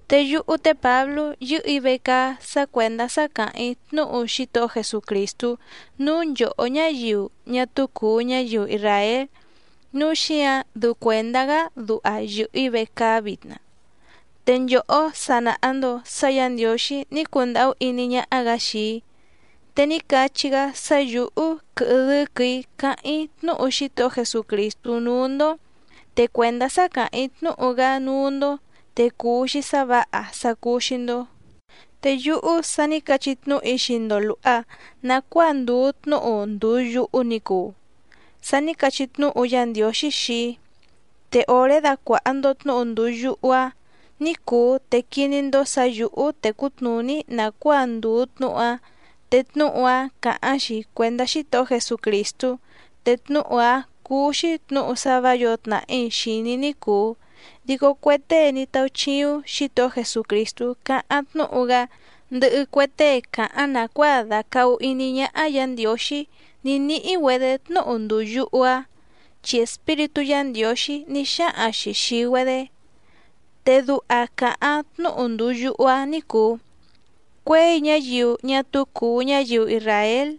Te yúhú té Pǎblú yɨ́hɨ̀‑í vecaá sá cuèndá sá càháⁿ‑í tnúhu Xítohó Jesucrìstú núú nchòhó ñáyiu ñá túú cùu ñáyiu isràél, núu xíǎⁿ dɨu cuèndá‑gá duha yɨ̀hɨ‑í vecaá vitna. Te nchòhó sa nàha‑ndo sá Yǎ Ndiǒxí ní cundàhú iní ñáhá‑gǎ xii‑í, te ní cachí‑gá sá yǔhú quɨhɨ dɨ́quɨ̀‑í cáháⁿ‑í tnúhu Xítohó Jesucrìstú núú‑ndó, te cuèndá sá càháⁿ‑í tnúhu‑gá núú‑ndó te cuu‑xi sá vǎha sá cúú‑xí‑ndó. Te yúhú sa ní cachí tnúhu‑í xii‑ndo lùha nacuáa ndùu tnúhu ndùu yuhu ni cuu, sá nǐ cachí tnúhu Yá Ndiǒxí xii‑í. Te òré dàcuaha‑ndo tnúhu ndùu yuhu‑áⁿ ní cùu te quiní‑ndó sǎ yǔhú tècú tnùní‑í nàcuáa ndùu tnúhu‑áⁿ, te tnúhu‑áⁿ càháⁿ‑xi cuèndá Xítohó Jesucrìstú. Te tnúhu‑áⁿ cúú‑xí tnǔhu sá vǎ yǒo tnàhí xìní ní cùu, dico cue tée ní táúchíúⁿ Xǐtohó Jesucrìstú cáháⁿ tnúhu‑gá, ndɨhɨ cue tée càháⁿ nàcuáa dàcahu iní ñáhá Yǎ Ndiǒxí ní níhí‑güedě tnúhu ndùu yuhu‑áⁿ, chi Espíritú Yǎ Ndiǒxí ní xáhaⁿ‑xi xìi‑güedé. Te duha càháⁿ tnúhu ndùu yuhu‑áⁿ ní cùu: “Cuěi ñáyiu ñá túú cùu ñáyiu isràél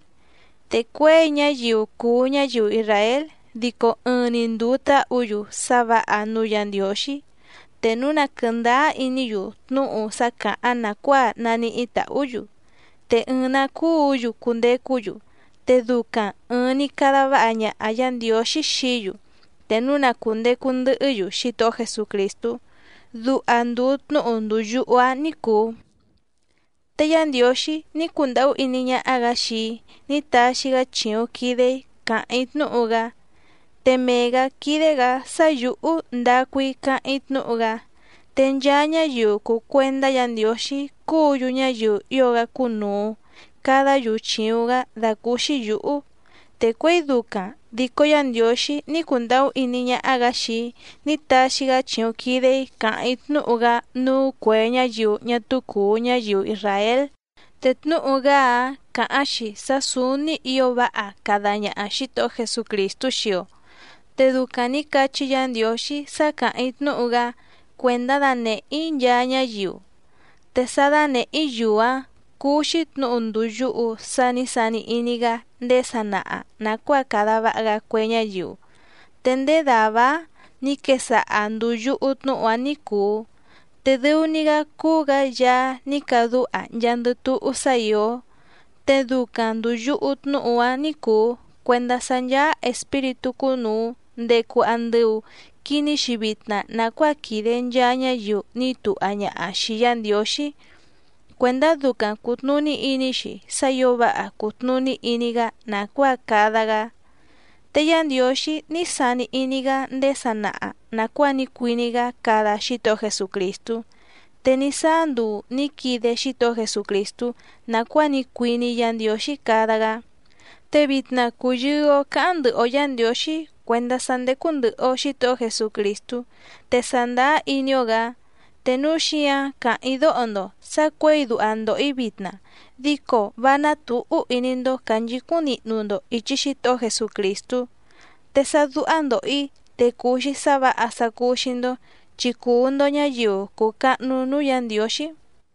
te cuěi ñáyiu cùu ñáyiu isràél dico ɨɨⁿ‑ni ndùu táhǔ‑yu sá vǎha núú Yǎ Ndiǒxí, te núu na quɨ̀ndáá iní‑yu tnúhu sá càháⁿ nàcuáa naníhí tàhú‑yu, te ɨɨⁿ‑nǎ cúǔ‑yu cundecú‑yu, te ducaⁿ ɨ̀ɨⁿ‑ni cada váha ñaha Yǎ Ndiǒxí xií‑yu te núu na cùndecu ndɨhɨ́‑yu Xítohó Jesucrìstú”, duha ndùu tnúhu ndùu yuhu‑áⁿ ní cùu. Te Yá Ndiǒxí ní cundàhú iní ñáhá‑gǎ xii‑í ní taxi‑gá chìuⁿ quide‑í càháⁿ‑í tnúhu‑gá, te mee‑gǎ quídé‑gǎ sá yǔhú ndacu‑í cáháⁿ‑í tnúhu‑gá. Te nchaa ñáyiu cùu cuendá Yǎ Ndiǒxí cúǔ‑yu ñáyiu ío‑gá cúnùu cadá‑yu chìuⁿ‑gá dàcúúxí yǔhú, te cuěi ducaⁿ dico Yá Ndiǒxí ní cundàhú iní ñáhá‑gǎ xii‑í ní taxi‑gá chìuⁿ quide‑í càháⁿ‑í tnúhu‑gá núú cuè ñáyiu ñá túú cùu ñáyiu isràél. Te tnúhu‑gá‑áⁿ càháⁿ‑xi sá sǔúní ǐo váha cada ñaha Xǐtohó Jesucrìstú xii‑o. Te ducaⁿ nǐ cachí Yǎ Ndiǒxí sá càháⁿ‑í tnúhu‑gá cuèndá danèhé‑í nchaa ñáyiu. Te sá dánèhé‑í‑yu‑áⁿ cúú‑xí tnǔhu ndùu yuhu sá nǐ sani iní‑gá ndéé sanaha nàcuáa cada váha‑gá cue ñáyiu. Te ndéé dàvá‑áⁿ nǐ quesaha ndùu yuhu tnúhu‑áⁿ ní cùu. Te dɨu‑ni‑gá cúú‑gǎ Yaá ní cadúha nchaandɨ túhú sá ìó. Te ducaⁿ ndùu yuhu tnúhu‑áⁿ ní cùu cuendá sá ncháá espíritú cúnùu ndecu andɨu quiní‑xi vitna nàcuáa quìde nchaa ñáyiu ní tuha ñaha xìi Yá Ndiǒxí cuèndá ducaⁿ cùtnuní iní‑xi sá ǐo váha cùtnuní iní‑gá nàcuáa cada‑gá. Te Yá Ndiǒxí ní sani iní‑gá ndéé sanaha nàcuáa ní cuiní‑gá cada Xítohó Jesucrìstú, te ní sáá nduu nǐ quide Xítohó Jesucrìstú nàcuáa ní cuiní Yǎ Ndiǒxí cada‑gá. Te vitna cùyɨɨ‑o cáháⁿ ndɨhɨ‑o Yǎ Ndiǒxí cuèndá sá ndécú ndɨ̀hɨ‑o Xítohó Jesucrìstú, te sàndáá iní‑ó‑gǎ. Te núu xíǎⁿ càháⁿ‑í dóho‑ndo sǎ cuěi duha ndòho‑í vitna dico vá ná tǔhú iní‑ndó cànchicúⁿ nihnu‑ndo ìchi Xítohó Jesucrìstú. Te sá dúhá ndòho‑í te cùu‑xi sá vǎha sá cúú‑xí‑ndó, chi cuu‑ndo ñǎyiu cùu cahnu núú Yǎ Ndiǒxí.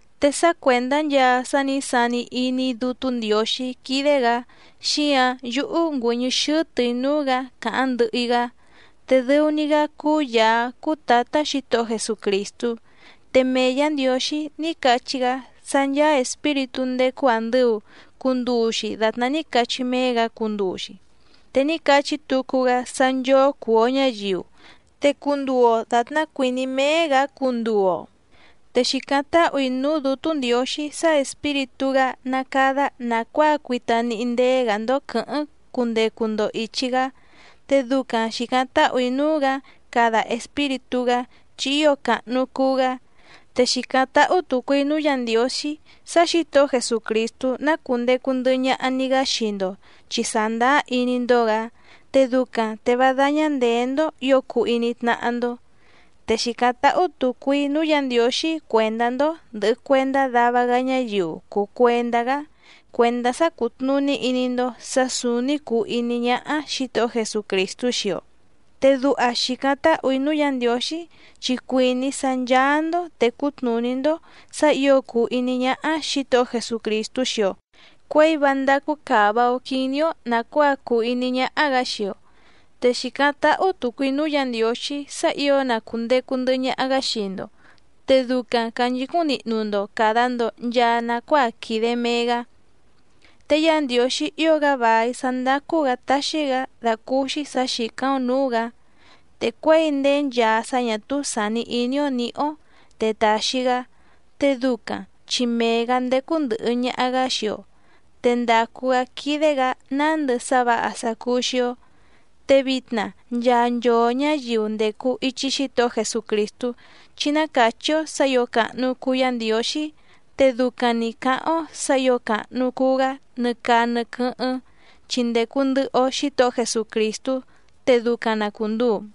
Te sá cuèndá nchaa sá nǐ sani iní Dútú Ndiǒxí quídé‑gǎ xíǎⁿ yúhú ngüɨ̀ñɨ́ xɨ́tɨ̀‑í núú‑gǎ càháⁿ ndɨhɨ‑í‑gá, te dɨu‑ni‑gá cúú Yàá cúú Tǎtá Xǐtohó Jesucrìstú. Te mee Yǎ Ndiǒxí ní cachí‑gá sá ncháá espíritú ndécú àndɨu cunduu‑xi datná ní cachí méé‑gǎ cunduu‑xi. Te ní cachí tucu‑gá sá nchóó cùu‑o ñáyiu, te cunduu‑o dàtná cuìní méé‑gǎ cunduu‑o. Te xìcáⁿ táhù‑í núú Dǔtú Ndiǒxí sá Espíritú‑gá ná cádá nàcuáa cuita níhí ndéé‑gǎ‑ndó quɨ̌hɨ́ⁿ cundecu‑ndo ìchi‑gá, te ducaⁿ xìcáⁿ táhù‑í núú‑gǎ cada Espíritú‑gá chi ío càhnu cuu‑gá. Te xìcáⁿ táhú tùcu‑í núú Yǎ Ndiǒxí sá Xǐtohó Jesucrìstú ná cùndecu ndɨhɨ ñaha‑ni‑gá xii‑ndo chi sàndáá iní‑ndó‑gǎ, te ducaⁿ te vá dáñá ndèé‑ndó ǐo cuu iní tnáhá‑ndó. Te xìcáⁿ táhú tùcu‑í núú Yǎ Ndiǒxí cuèndá‑ndó ndɨ̀hɨ cuendá dava‑gá ñáyiu cùu cuendá‑gá, cuèndá sá cútnùní iní‑ndó sǎ sǔúní cùu iní ñáhá Xǐtohó Jesucrìstú xii‑o. Te duha xìcáⁿ táhù‑í núú Yǎ Ndiǒxí chi cuìní‑í sá ncháá‑ndó tècú tnùní‑ndó sǎ ǐo cùu iní ñáhá Xǐtohó Jesucrìstú xii‑o cuěi vá ndácú càva‑o quiní‑ó nàcuáa cùu iní ñáhá‑gǎ xii‑o. Te xìcáⁿ táhú tùcu‑í núú Yǎ Ndiǒxí sá ǐo na cùndecu ndɨhɨ ñaha‑gá xii‑ndo, te ducaⁿ cànchicúⁿ nihnu‑ndo càda‑ndo nchaa nacuáa quìde mee‑gá. Te Yá Ndiǒxí ío‑gá vài sá ndácú‑gǎ táxí‑gǎ dàcúúxí sǎ xìcáⁿ‑ó nǔú‑gǎ, te cuěi ndéé nchaa sá ñà túú sàni iní‑ó nǐhí‑ó te tàxi‑gá, te ducaⁿ chi mee‑gǎ ndécú ndɨ̀hɨ ñaha‑gá xii‑o, te ndàcu‑gá quídé‑gǎ nándɨ sá vǎha sá cúú‑xí‑ó. Te vitna nchaa nchoo ñǎyiu ndècu ichi Xítohó Jesucrìstú chí ná càchí‑ó sǎ ǐo càhnu cuu Yá Ndiǒxí, te ducaⁿ‑ni cǎháⁿ‑ó sǎ ǐo càhnu cuu‑gá nɨ caa nɨ quɨ́hɨ́ⁿ chi ndècu ndɨhɨ‑o Xítohó Jesucrìstú. Te ducaⁿ na cùnduu.